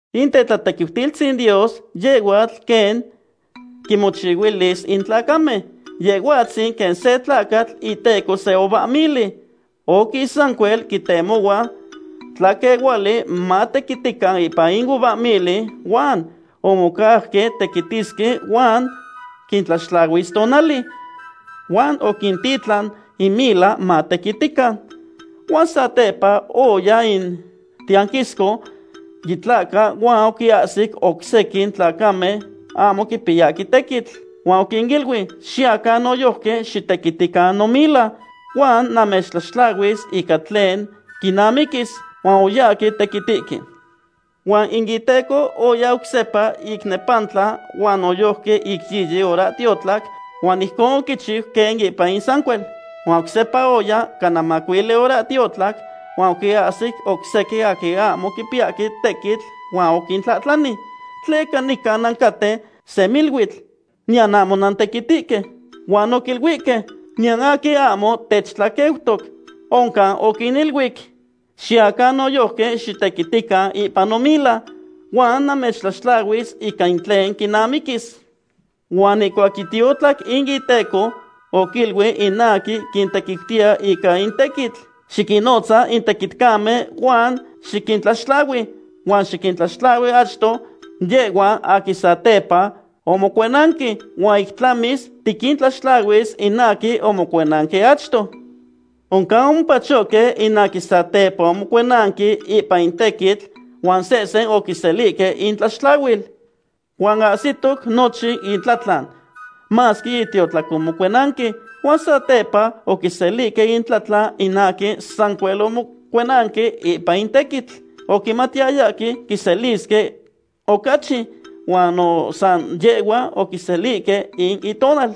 In tetlatequiutilistzin Dios yehhuatl quen quinmochihuilis in tlacamen. Yehhuatzin quen se tlacatl iteco se uvahmili. Oquis sancuel quintemohua tlaquehuali matequitican ipan in uvahmili. Huan omocauque tequitisque huan quintlaxtlahuis tonali. Huan oquintitlan in mila matequitican. Huan satepa oya in tiyanquisco yitlahca huan oquinahsic oc sequin tlacamen ahmo quipiyahque tequitl. Huan oquiniluic: “Xiyacan noyojqui xitequitican nomila, huan namechtlaxtlahuis ica tlen quinamiquis.” Huan oyahque tequitihque. Huan in iteco oya oc sepa ic nepantla huan noyojqui ic yiyi horahtiotlac huan ijcon oquichiu quen ipan in sancuel. Huan oc sepa oya cana macuili horahtiotlac huan oquinahsic oc sequin aquin ahmo quipiyahque tequitl huan oquintlahtlani: “¿Tleca nican nancaten semiluitl, niyan ahmo nantequitihque?” Huan oquiluihque: “Niyan aquin ahmo techtlaqueutoc.” Oncan oquiniluic: “Xiyacan noyojqui xitequitican ipan nomila, huan namechtlaxtlahuis ica tlen quinamiquis.” Huan ihcuac yitiotlac in iteco oquiluic in aquin quintequiutiya ica in tequitl: “Xiquinnotza in tequitcamen huan xiquintlaxtlahui. Huan xiquintlaxtlahui achto yehhuan aquin satepa omocuenanque, huan ic tlamis tiquintlaxtlahuis in aquin omocuenanque achto.” Oncan omopachohque in aquin satepa omocuenanque ipan in tequitl huan sehsen oquiselihque intlaxtlahual. Huan ahsitoc nochin intlatlan, masque yitiotlac omocuenanque. Huan satepa oquiselihque intlatlan in aquin sancuel omocuenanque ipan in tequitl. Oquimatiyayahque quiselisque ocachi, huan no san yehhua oquiselihque in intonal.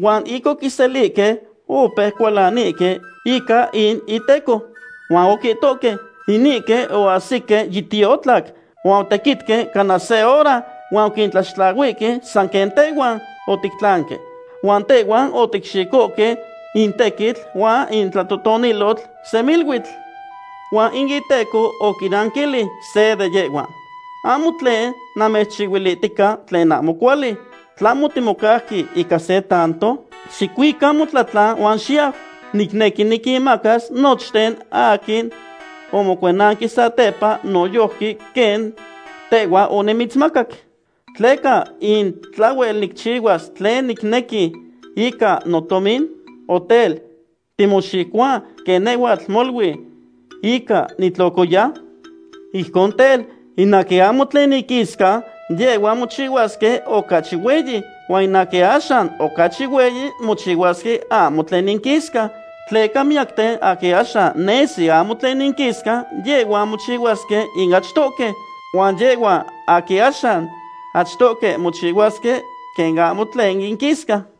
Huan ic oquiselihque, opeuque cualanihque ica in iteco, huan oquihtohque: “Inihque oahsihque yitiotlac huan otequitque cana se hora huan oquintlaxtlahuihque san quen tehhuan otictlanque, huan tehhuan oticxicohque in tequitl huan in tlatotonilotl semiluitl.” Huan in iteco oquinanquilic se de yehhuan: “Ahmo tlen namechchihuilihtica tlen ahmo cuali. ¿Tlahmo otimocauque ica se tanto? Xicuica motlatlan huan xiyau. Nicnequi niquinmacas nochten aquin omocuenanque satepa noyojqui quen tehhua onimitzmacac. ¿Tleca in tlahhuel nicchihuas tlen nicnequi ica notomin? O tel, ¿timoxicohua quen nehhuatl molui inca nitlocoya?” Ijcon tel, in aquin ahmo tlen inquisca, yehhuan mochihuasque ocachi hueyi. Huan in aquin axan ocachi hueyi mochihuasque ahmo tlen inquisca. Tleca miyacten aquin axan nesi ahmo tlen inquisca, yehhuan mochihuasque in achtohque. Huan yehhuan aquin axan achtohque mochihuasque quen ahmo tlen inquisca.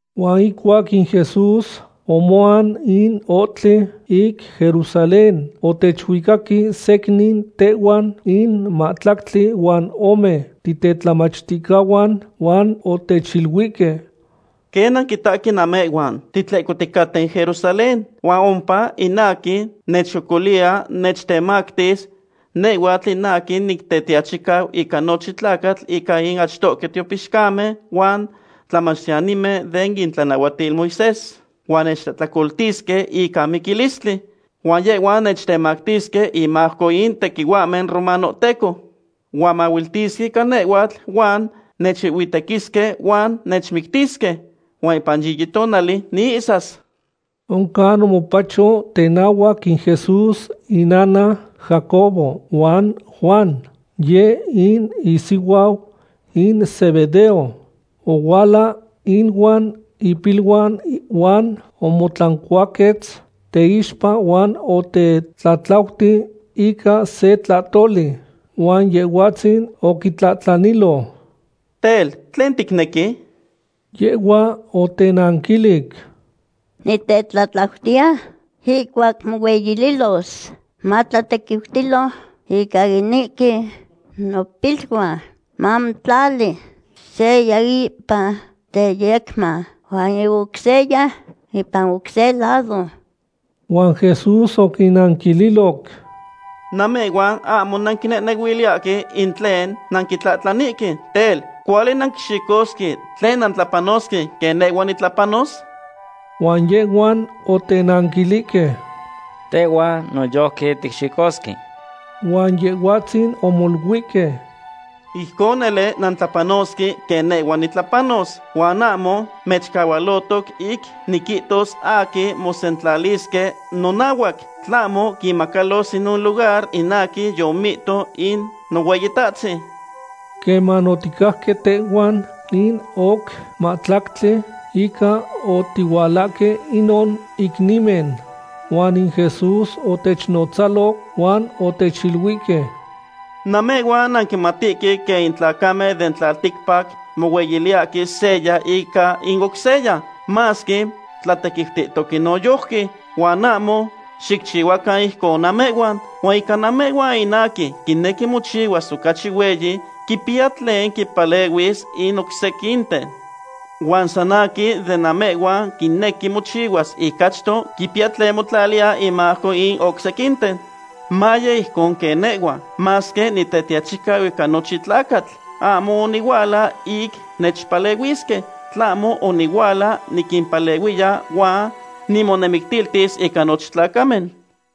Huan ihcuac in Jesús omoan in ohtli ic Jerusalén, otechuicaque secnin tehhuan in mahtlactli huan ome titetlamachticahuan huan otechiluihque: ―Quen nanquitahque namehhuan, titlehcoticaten Jerusalén, huan ompa in aquin nechcocoliya nechtemactis nehhuatl in aquin Nitetiachicau ica nochin tlacatl ica in achtohque tiopixcamen huan tlamachtiyanimen den itlanahuatil Moisés. Huan nechtlahtlacoltisque ica miquilistli. Huan yehhuan nechtemactisque inmajco in tequihuahmen romanohteco. Huan mahuiltisque ica nehhuatl huan nechuihhuitequisque huan nechmictisque. Huan ipan yiyi tonali niihsas. Oncan omopacho tenahuac in Jesús innana Jacobo huan Juan, yeh in isihuau in Zebedeo. Ohuala inuan ipiluan huan omotlancuaquetz teixpa huan otetlatlauti ica se tlahtoli. Huan Yehhuatzin oquitlahtlanilo: ―Tel, ¿tlen ticnequi? Yehhua otenanquilic: ―Nitetlatlautiya ihcuac mohueyililos, matlatequiutilo ica inihque nopiluan mamotlali seya ipan teyecman huan in oc seya ipan oc se lado. Huan Jesús oquinnanquililoc: ―Namehhuan ahmo nanquinehnehuiliyahque in tlen nanquitlahtlanihque. Tel, ¿cuali nanquixicosque tlen nantlapanosque quen nehhua nitlapanos? Huan yehhuan otenanquilihque: ―Tehhuan noyojqui ticxicosque. Huan Yehhuatzin omoluihque: ―Ijcon nele nantlapanosque quen nehhua nitlapanos. Huan ahmo nechcahualotoc ic niquihtos aquin mosentlalisque nonahuac, tlahmo quinmacalos inon lugar in aquin yomihto in Nohueyitahtzin. Queman oticajque tehhuan in oc mahtlactli, inca oticualanque inon icnimen. Huan in Jesús otechnnotzalo huan otechiluihque: ―Namehhuan nanquimatihque quen in tlacamen den tlalticpac mohueyiliyahque seya ica in oc seya, masque tlatequiutihtoque noyojqui. Huan ahmo xicchihuacan ijcon namehhuan. Huan ica namehhuan in aquin quinequi mochihuas ocachi hueyi quipiya tlen quimpalehuis in oc sequinten. Huan san aquin de namehhuan quinequi mochihuas in achto quipiya tlen motlaliya inmajco in oc sequinten. Maye ijcon quen nehhua. Masque Nitetiachicau ica nochin tlacatl, ahmo onihuala ic nechpalehuisque, tlahmo onihuala niquimpalehuiya huan nimonemictiltis ica nochin tlacamen.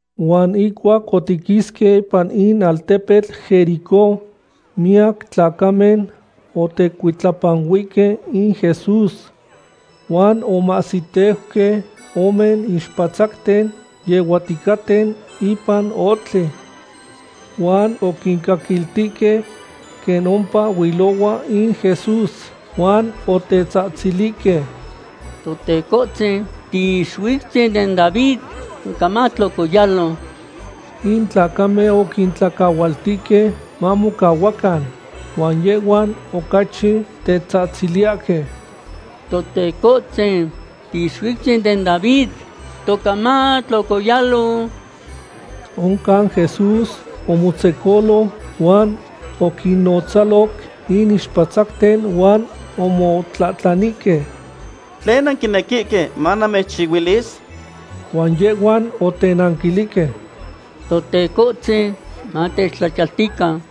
Huan ihcuac otiquisque ipan in altepetl Jericó, miyac tlacamen otecuitlapanuihque in Jesús. Huan omahsiteuque ome ixpatzacten yehuaticaten ipan ohtli. Huan oquincaquiltihque quen ompa huilohua in Jesús, huan otetzahtzilihque: ―¡Totecotzin, Tiixuiutzin den David! ¡Toca matlocoyalo! In tlacamen oquintlacahualtihque mamocahuacan. Huan yehhuan ocachi tetzahtziliyahque: ―¡Totecohtzin, Tiixuiutzin den David! ¡Toca matlocoyalo! Oncan Jesús omotzecolo huan oquinnotzaloc in ixpatzacten huan omotlahtlanihque: ―¿Tlen nanquinequihque manamechchihuilis? Huan yehhuan otenanquilihque: ―¡Totecohtzin, matechtlachiyaltican!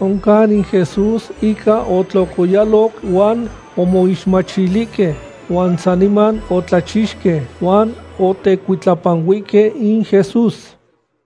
Oncan in Jesús inca otlocoyaloc huan omoixmachilihque. Huan saniman otlachixque, huan otecuitlapanuihque in Jesús.